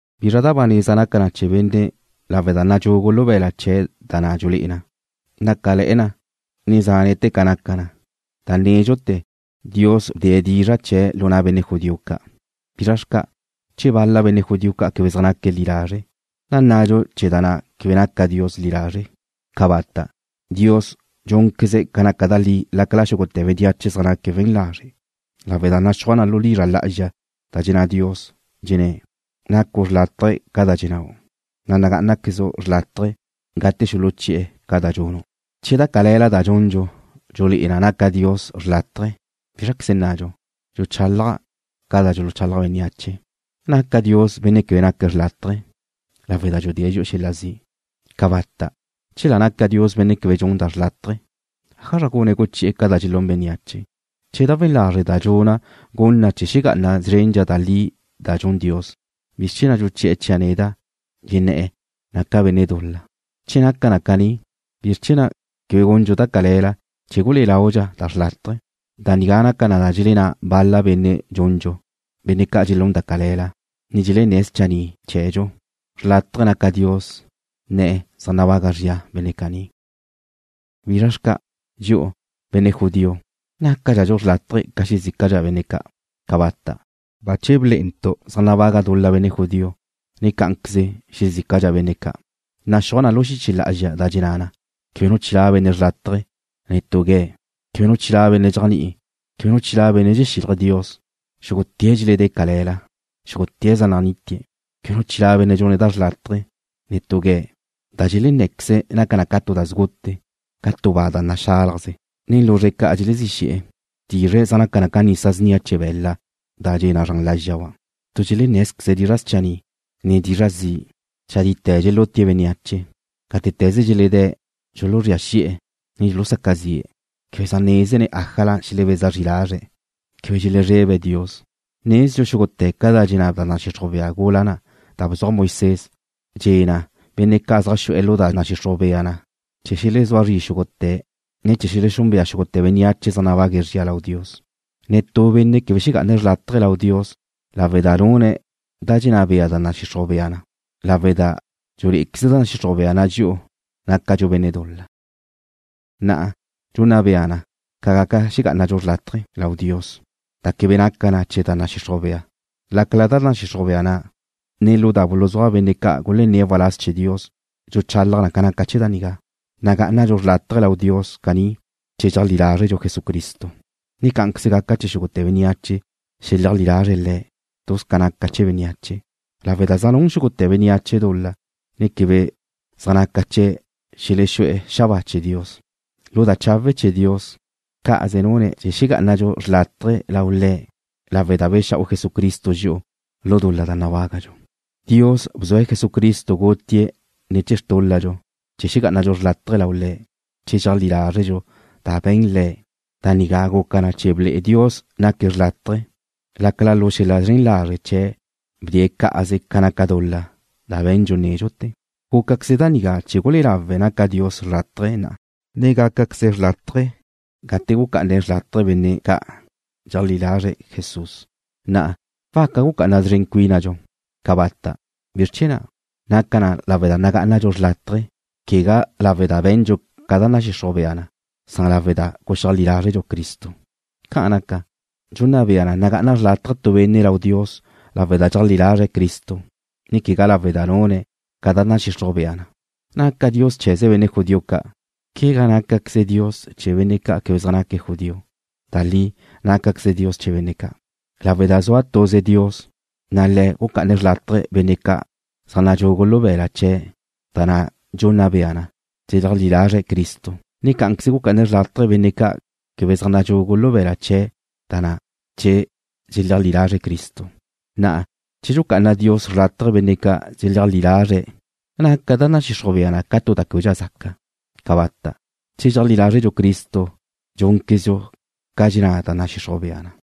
¿Bizra da ba neza naca na chee̱ benne' lawe' da nadxugu lu be̱la' chee̱' da na' dxulé'e na? Nácale̱'e̱ na, ne zánete̱ ca naca na. Da nédxute̱, Dios bdee̱' dizra' chee̱' lu na' benne' judío ca'. ¿Bizra xca'? Che bal-la benne' judío ca' quebe zaj naque̱' li lazre', ¿nnadxu chee̱ da na' quebe naca Dios li lazre'? ¡Cabata'! Dios dxúnqueze̱' ca naca da li lácala xúgute̱ bénneache zaj naque̱' we̱n lazre', lawe' da naxúaj lu dizra' lá'azxa da dxenná Dios. Dxenné̱': Nacu' xrlátaje ca da dxennáu', na' wegá'anaquezu' xrlátaje gate xuluchí'e̱ ca da dxunu'. Che da cale̱la da dxundxu dxulé'e na naca Dios xrlátaje, ¿Bízraqueze nnadxu? (Dxuchálaja' ca da dxuluchalaj bénneache.) ¿Naca Dios benne' quebe naca xrlátaje lawe' da dxudée̱' dxi'u xel-la zi'? ¡Cabata'! Chela naca Dios Benne' quebe dxun da xrlátaje, ¿ájazra gune̱' guchi'e̱ ca da dxelún bénneache? Che da we̱n lazre' da dxuna' gun na chee̱ xegá'ana zrendxa da li da dxun Dios, ¿bizr chee̱ na' dxuchi'e̱ chia' neda', dxenné̱' naca' benne' dul-la? Che naca na caní, ¿bizr chee̱ na' quebe gundxu da cale̱la chee̱ gulé'e laudxa da xrlátaje? Da nigá naca na da dxelenná bal-la benne' dxundxu, benne' ca' dxelún da cale̱la, ne dxelenné̱' schanni' chee̱dxu. Xrlátaje naca Dios nne̱' zaj nabaga zria benne' caní. ¿Bizra xca'? Dxi'u, benne' judío, ¿nácadxadxu xrlátaje ca xezícadxa benne' ca'? ¡Cabata'! Bache blé'entu' zaj nabaga dul-la benne' judío, ne cá'anqueze xezícadxa benne' ca'. Naxúaj lu xiche lá'azxa da dxenná na: Quebe nu chilá' benne' xrlátaje, netú gue̱'. Quebe nu chilá' benne' dxéajni'ine̱'. Quebe nu chilá' benne' dxexílaje̱' Dios. Xúgute̱' dxeledé̱' cale̱la. Xúgute̱' zaj nanítie̱'. Quebe nu chilá' benne' dxune̱' da xrlátaje, netú gue̱'. Da dxelenné̱queze̱' naca na ca tu da sgute, ca tu ba da naxálajze. Nen luzre̱' ca' dxelezí xe̱'e̱. Xrtizre̱' zaj naca na ca nisa snia chee̱ be̱la' da dxe na zran lázxaba'. Tu dxelenné̱zqueze̱' dizra' schanni', ne dizra' zi'. Chadite̱ dxelútie̱' bénneache. Gátete̱ze dxeledée̱' dxuluzría xi'e̱, ne dxulusaca zi'e̱. Quebe zaj nézene̱' ájala xelebeza zri lazre̱'. Quebe dxelezrebe̱' Dios. Nezdxu xúgute̱ ca da dxenná da nadxixruj bea gula na' da bzuaj Moisés, dxe̱ na benne' ca' zaj xu'e̱ lu na' da nadxixruj bea na na', chee̱ xelezúa zri xúgute̱', ne chee̱ xelexúnbea xúgute̱ bénneache zaj nabague̱' zria lau Dios. Netú benne' quebe xegá'ane̱' xrlátaje lau Dios lawe' da nune̱' da dxenná bea da nadxixruj bea na, lawe' da dxulé'eze da nadxixruj bea na dxi'u nácadxu benne' dul-la. Na'a, dxunna bea na ca gaca xegá'anadxu xrlátaje lau Dios, da quebe naca na ne̱ chee̱ da nadxixruj bea na, lácala lu da nadxixruj bea na, ne lu da buluzúaj benne' ca' gulenné̱' waláz chee̱ Dios dxuluchalaj na ca naca chee̱ da nigá. Nagá'anadxu xrlátaje lau Dios caní che dxeajlí lázredxu Jesucristo, ne cá'anqueze gaca chee̱ xúgute̱ bénneache xeleajlí lazre̱' Le̱'. Tuz ca naca chee̱ bénneache lawe' da zaj nun xúgute̱ bénneache dul-la, ne quebe zaj naca chee̱' xelexú'e̱ lu xabáa chee̱ Dios. Lu da chawe' chee̱ Dios, cá'aze nune̱' chee̱ xegá'anadxu xrlátaje lau Le̱' lawe' da bexa'u Jesucristo dxi'u lu dul-la da nabágadxu. Dios bzue̱' Jesucristo gutie̱' ne̱ chee̱ xtúl-ladxu chee̱ xegá'anadxu xrlátaje lau Le̱' che dxeajlí lázredxu da be̱n Le̱'. Da nigá guca na chee̱ ble'e Dios naque̱' xrlátaje lácala lu xel-la zren lazre' chee̱' bdee̱' cá'aze ca naca dul-la da be̱ndxu nédxute̱. Gúcaqueze da nigá chee̱ gulé'e lawe' naca Dios xrlátaje na'a, ne gácaqueze̱' xrlátaje gate gucá'ane̱' xrlátaje benne' ca' dxeleajlí lazre̱' Jesús. Na'a, ¿waca gucá'ana szren cuínadxu? ¡Cabata'! ¿Bizr chee̱ na'? Naca na lawe' da nagá'anadxu xrlátaje, quegá lawe' da be̱ndxu ca nadxixruj bea na, san lawe' da guxeajlí lázredxu Cristo. Ca'an naca, dxunna bea na nagá'ana xrlátaje tu benne' lau Dios lawe' da dxeajlí lazre̱' Cristo, ne quegá lawe' da nune̱' ca da nadxixruj bea na. ¿Naca Dios chee̱ze benne' judío ca'? ¿Quegá nácaqueze̱' Dios chee̱ benne' ca' quebe zaj naque̱' judío? Da li nácaqueze̱' Dios chee̱ benne' ca' lawe' da zua tuze Dios, na' Le̱' gucá'ane̱' xrlátaje benne' ca' zaj nadxugu lu be̱la' chee̱' da na' dxunna bea na che dxeleajlí lazre̱' Cristo, ne cá'anqueze gucá'ane̱' xrlátaje benne' ca' quebe zaj nadxugu lu be̱la' chee̱' da na', che dxeleajlí lazre̱' Cristo. Na'a che dxucá'ana Dios xrlátaje benne' dxeleajlí lázreze̱', ¿naca da nadxixruj bea na tu da québedxa zaca? ¡Cabata'! Che dxéajle̱dxu chee̱ Cristo dxúnquezdxu ca dxenná da nadxixruj bea na.